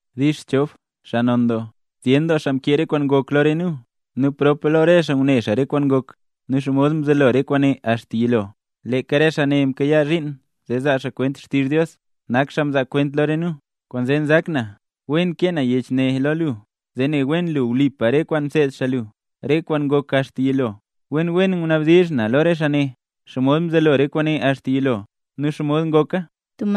Dix Chof, xaa non doo. Zyen xaa mkee re kwaan ngok lo re nu. Nu prop lo re xaa ngune xaa re kwaan ngok, nu xomod mzelo re kwaane axta yilo, leeka re xaa ne mkayaa zhiin zee zaa xaa kwent xtizh Dios, nak xaa mzaa kwenta lo re nu. Kwaanzee nzak na wen kee na yech ne lo lu zee ne wen lu wlipa re kwaan mseed xaa lu, re kwaan ngok axta yilo. Wen wen ngunabdizh na lo re xaa ne, xomod mzelo re kwaane axta yilo nu xomod ngoka.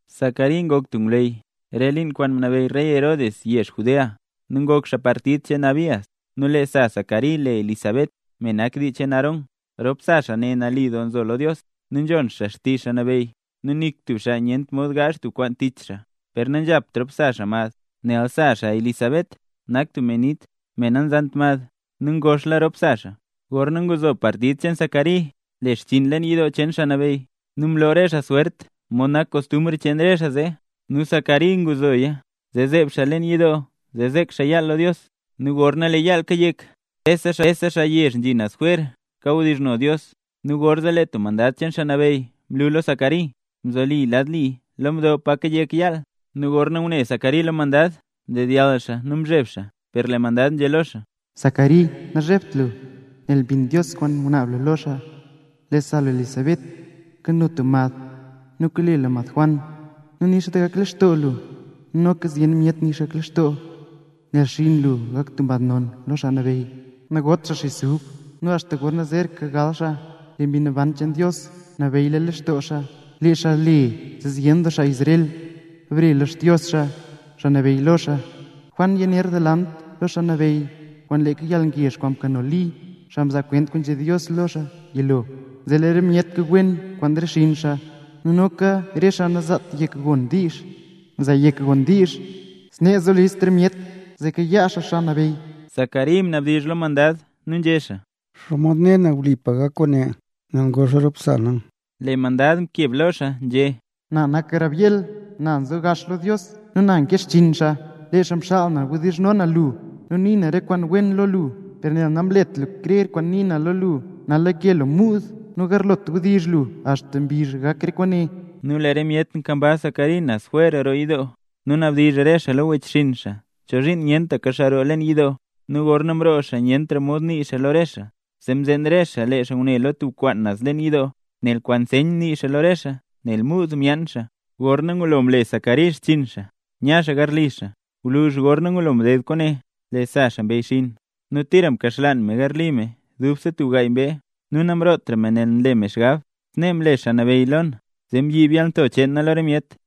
Zacari ngok tub ngwleyy, re liin kwaan mnabeyy rey Herod re yezh Judea, nu ngok xaa partid cheen Abías. Nu lee sa Zacari le Elizabet, me nak dii cheen Aarón. Rop sa xaa ne nali doo nzo lo Dios, nu nzhon xaa xtizh Xaa Nabeyy nu nik tub xaa nyent mod gaazh tub kwaan tich xaa. Per nanzhapt rop sa xaa mad, nel sa xaa Elizabet nak tub me nit, me nazant mad nu ngoxla rop sa xaa. Gorna nguzo partid cheen Zacari le xchiin leen yidoo cheen Xaa Nabeyy, nu mloo re xaa swert mod nak kostumbr cheen re xaa zee, nu Zacari nguzoya zee zeeb xaa leen yidoo zee zek xaa yaal lo Dios. Nu gorna lee yaal kayek, rese xaa yezh nzhi naz jwer kawdizhno Dios. Nu gorzee lee tub mandad cheen Xaa Nabeyy mlu lo Zacari, nzolisa lad li lo mdo pa kayek yaal. Nu gorna ngune Zacari lo mandad, mdedyall xaa nu mzheb xaa. Per lee mandad nzhé lo xaa: —Zacari, nazhebt lu, nel mbinla Dios kwaan ngunaab lu lo xaa; lee sa lu, Elizabet, kano tub mad, nu kole lu mad Juan. Nu nix doo gak lextoo lu, nu noka zyen doo myet nix doo gak lextoo lee xaa gal, nel xinn lu gak tub xaa non lo Xaa Nabeyy. Nagot xaa xis ub, nu axta gorna zeeraka gal xaa lee Mbi Naban cheen Dios nabeyyla lextoo xaa. Lee xaa le zee zyen doo xaa Israel bare lo Xdios xaa, Xaa Nabeyy lo xaa. Juan yaner delant lo Xaa Nabeyy, kwaan leeka Mbi Naban nu yalngezh kwaan mkano Li, xaa mzaa kwent kwaan nzhé Dios lo lee xaa yilo. Zee lee re myet kwi wen kwaan re xinn xaa, nu noka re xaa nazaat yek gon diizh, zaa yek gona. Snee zo list re myet zee kayaa xaa Xaa Nabeyy. Zacari mnabdizh lo mandad nu nzhé xaa: —¿Xomod ne na wlipa gak kwaane? Nel ngoxla rop sa na. Lee mandad mkeb lo xaa, nzhé: —Na nak Gabriel, na nzo gax lo Dios nu na nkee xchiin xaa. Lee xaa mxaal na wdizhno na lu, nu nii na re kwaan wen ne lo lu. Per nel namlet lu krer kwaan nii na lo lu, nal lake lu muud, nu nagarlot wdizh lu axta mbizh gak re kwaane. Nu lee re myet nkambaz Zacari naz jwer roo yidoo, nu nabdizh re xaa lo wechxinn xaa chozhiin nyentaka xaa roo leen yidoo. Nu gorna mroo xaa nyentra mod nii xaa lo re xaa; zee mzeen re xaa lee xaa ngune lo tub kwaan naz leen yidoo, nel kwaan nseyn nii xaa lo re xaa, nel muud myaan xaa. Gorna ngulo mle Zacari xchiin xaa, nya xaa garli xaa. Gwluzh gorna ngulo mded kwaane, lee sa xaa mbeyyxiin, nu tira mkaxlaan me garli me dubse tub gaay mbee nu namrootra me nel nle me xgab: “Snee mle Xaa Nabeyy lo na, zee mbyiib yalnto cheen na lo re myet”.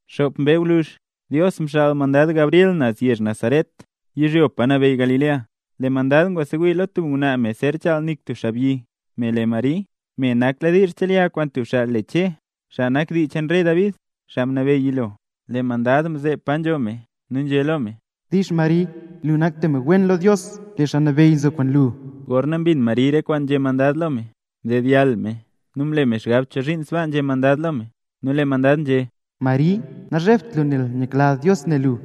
Xop mbee gwluzh, Dios mxaal mandad Gabriel naz yezh Nazaret yizhyo pa nabeyy Galilea, lee mandad ngwasewii lo tub ngwnaa me zer chaal nik tub xaabyi, me le Mari, me nakladiizh chelya kwaan tub xaabyi le Che, xaa nak dii cheen rey David, xaa mnabeyy yilo. Lee mandad mzeeb pa nzho me, nu nzhé lo me: —¡Dix Mari, lu nak tub me wen lo Dios! Dios, Xaa Nabeyy, nzo kwaan lu. Gorna mbin Mari re kwaan nzhé mandad lo me, mdedyall me nu mle me xgab chozhiin sbaa nzhé mandad lo me. Nu lee mandad nzhé: —Mari, nazhebt lu nel nyakla Dios ne lu.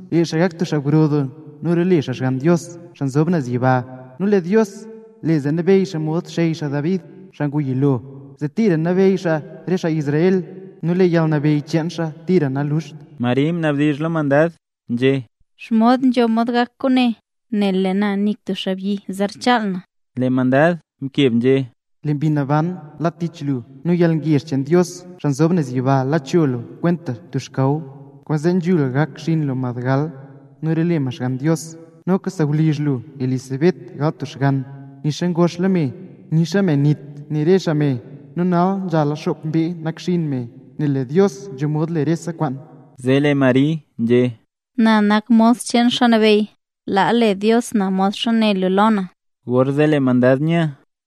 Lee xaa ne gak tub xaa gro doo nu lee xaa role Xgann Dios, xaa nzob naz yiba. Nu lee Dios, Xaa Nabeyy, le zee nabeyy xaa mod xey xaa David, xaa ngu yilo, zee tira nabeyy xaa re xaa Israel. Nu lee yalnabeyy cheen xaa tira naluxt. Mari mnabdizh lo mandad, nzhé: —¿Xomod nzho mod gak kwaane? Nel lee na nik tub xaabyi zer chaal na. Lee mandad mkeb nzhé: —Lee Mbi Naban la tich lu, nu lee yalngezh cheen Dios, xaa nzob naz yiba la cho lu kwenta tub xkaw. Kwaanzee nzhul gak xinn lu mad gal nu role xaa Xgann Dios. Noka sawlizh lu Elizabet gal tub xgann, nixa ngoxla me; nixa “me nit” nii re xaa me. Nu nal nzhala xop mbee nakxiin me, nel lee Dios nzho mod le rese kwaan. Zee lee Mari nzhé: —Na nak mos cheen Xaa Nabeyy, laa le Dios na modxa né lu lo na. Gorzee lee mandad nya.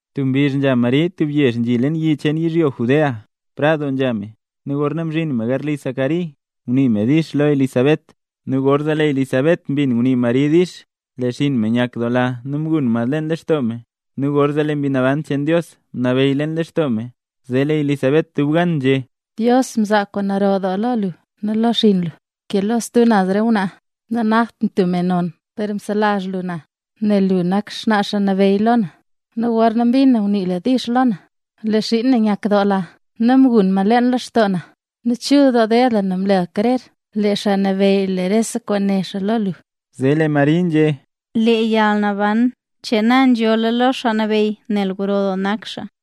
Tub mbizh nzha Mari tub yezh nzhi leen yi cheen yizhyo Judea, prad doo nzha me; nu gorna mzhin me garli Zacari ngunii me “dix” lo Elizabet. Nu gorzee lee Elizabet mbin ngunii Mari “dix”, lee xinn me nyakdoola nu mgun mad leen lextoo me nu gorzee lee Mbi Naban cheen Dios mnabeyy leen lextoo me. Zee lee Elizabet dub gan nzhé: —¡Dios mzaa kwaan gro doo lo lu nu lo xinn lu ke lo stub naz re ngwnaa! Nanakt na tub me non per mzeselach lu lo na, nel lu nak xnaa Xaa Nabeyy lo na. Nu gorna mbin na ngunii lu “dix” lo na, lee xiin na nyakdoola nu mgun mad leen lextoo na. ¡Chul doo ded lu nel mle lu krer lee Xaa Nabeyy le rese kwaan né xaa lo lu! Zee lee Mari nzhé: Lee yalnaban cheen na nzholl lo Xaa Nabeyy, nel gro doo nak Xaa Nabeyy,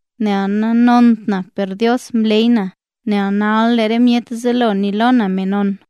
Nel nixa nanont na per Dios mleey na, nel nal lee re myet zelo nii lo na me non;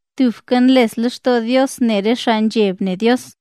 Tubka nles lextoo Dios ne re xaa nzheb ne Dios.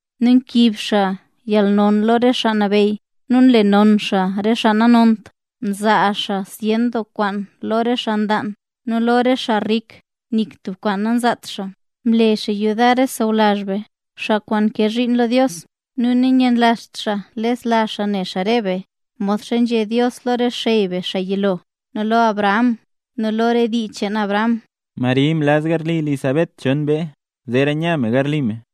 nu mkiib xaa yalnon lo re xaa nabeyy, nu mle non xaa re xaa nanont. Mzaa xaa zyen doo kwaan lo re xaa nlaan, nu lo re xaa rik nik tub kwaan namzaat xaa. Mle xaa yudar re sawlazh be, xaa kwaan nkee zhiin lo Dios; nu nanyanlazht xaa lesla xaa ne xaa re be, modxa nzhé Dios lo re xey be xaa yilo, nu lo Abraham, nu lo re dii cheen Abraham. Mari mlaz garli Elizabet chon mbee, zeera nya me garli me.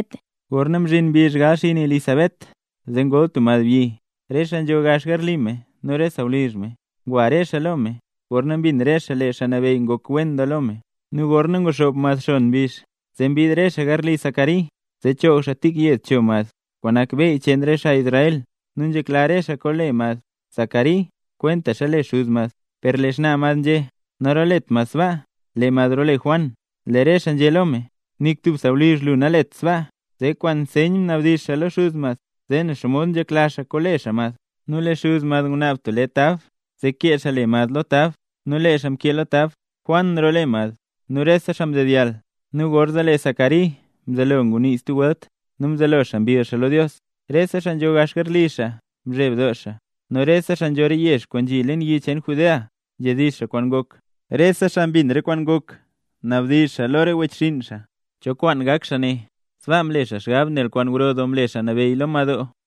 Gorna mzhin mbizh gal xinn Elizabet, zee ngol tub madbyi. Re xaa nzho gax garli me nu re sawlizh me, ngwa re xaa lo me, gorna mbin re xaa lee Xaa Nabeyy ngok wen doo lo me. Nu gorna nguxoob mad xon mbizh, zee mbid re xaa garli Zacari zee choog xaa tik yed cho mad kwaan nak beyy cheen re xaa Israel. Nu nzhekla re xaa kole mad Zacari kwentaxa le xuz mad. Per lee xnaa mad nzhé: —Narolet mad sbaa, lee mad role Juan. Lee re xaa nzhé lo me: —Nik tub sawlizh lu nalet sbaa. Zee kwaan nseyn mnabdizh xaa lo xuz mad, zee ne xomod nzhekla xaa kole xaa mad. Nu lee xuz mad ngunaab tub lee tab zee kee xaa le mad lo tab, nu lee xaa mkee lo tab: “Juan role mad”. Nu rese xaa mdedyall. Nu gorzee lee Zacari mzelo ngunii stub welt, nu mzelo xaa mbill xaa lo Dios. Rese xaa nzho gax garli xaa mzheb doo, nu rese xaa nzho re yezh kwaan nzhi leen yi cheen Judea nzhedizh kwaan ngok. Rese xaa mbin re kwaan ngok nabdizh lo re wechxinn: —¿Cho kwaan gak xaa ne? Sbaa mle xaa xgab nel kwaan gro doo mle Xaa Nabeyy lo madoo.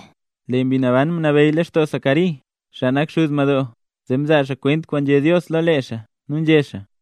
Lee Mbi Naban mnabeyy lextoo Zacari, xaa nak xuz madoo, zee mzaa xaa kwent kwaan nzhé Dios lo lee xaa, nu nzhé xaa: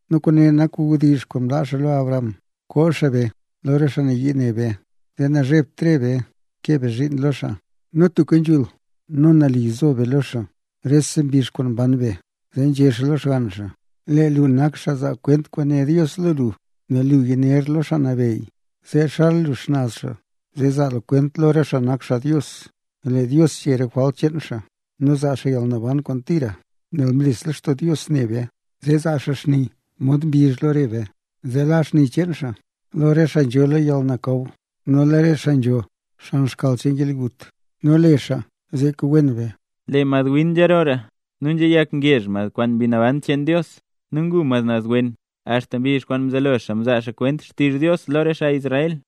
Nu kwaane nak wdizh kwaan mlaa xaa lo xey be Abraham: koo xaa be lo re xaa nayii ne be, zee nazhebt re be kee be zhiin lo xaa. Nu tubka nzhul nu nali zo be lo xaa, rese mbizh kwaan mban be. Zee nzhé xaa lo xgann xaa: “Lee lu nak xaa zaa kwent kwaan né Dios lo lu, xaa nzob naz yiba, nel lu yaner lo Xaa Nabeyy, zee xal lu xnaz xaa, zee zaa lu kwent lo re xaa nak xaa Dios, lee Dios chee re jwalt cheen xaa, nu zaa xaa yalnaban cheen xaa kwaan tira. Nel mles lextoo Dios ne be, zee zaa xaa xni mod mbizh lo re be, zee la xni cheen xaa lo re xaa nzho lo yalnakaw, nu lo re xaa nzho xan xkal cheen yalgut, nu le xaa zee kwi wen be kwaan lee xaa.” Lee madwin nzharoora nu nzhayak ngezh mad kwaan Mbi Naban cheen Dios, nu ngu mad naz wen, axta mbizh kwaan mzelo xaa zaa xaa kwent xtizh Dios lo re xaa Israel.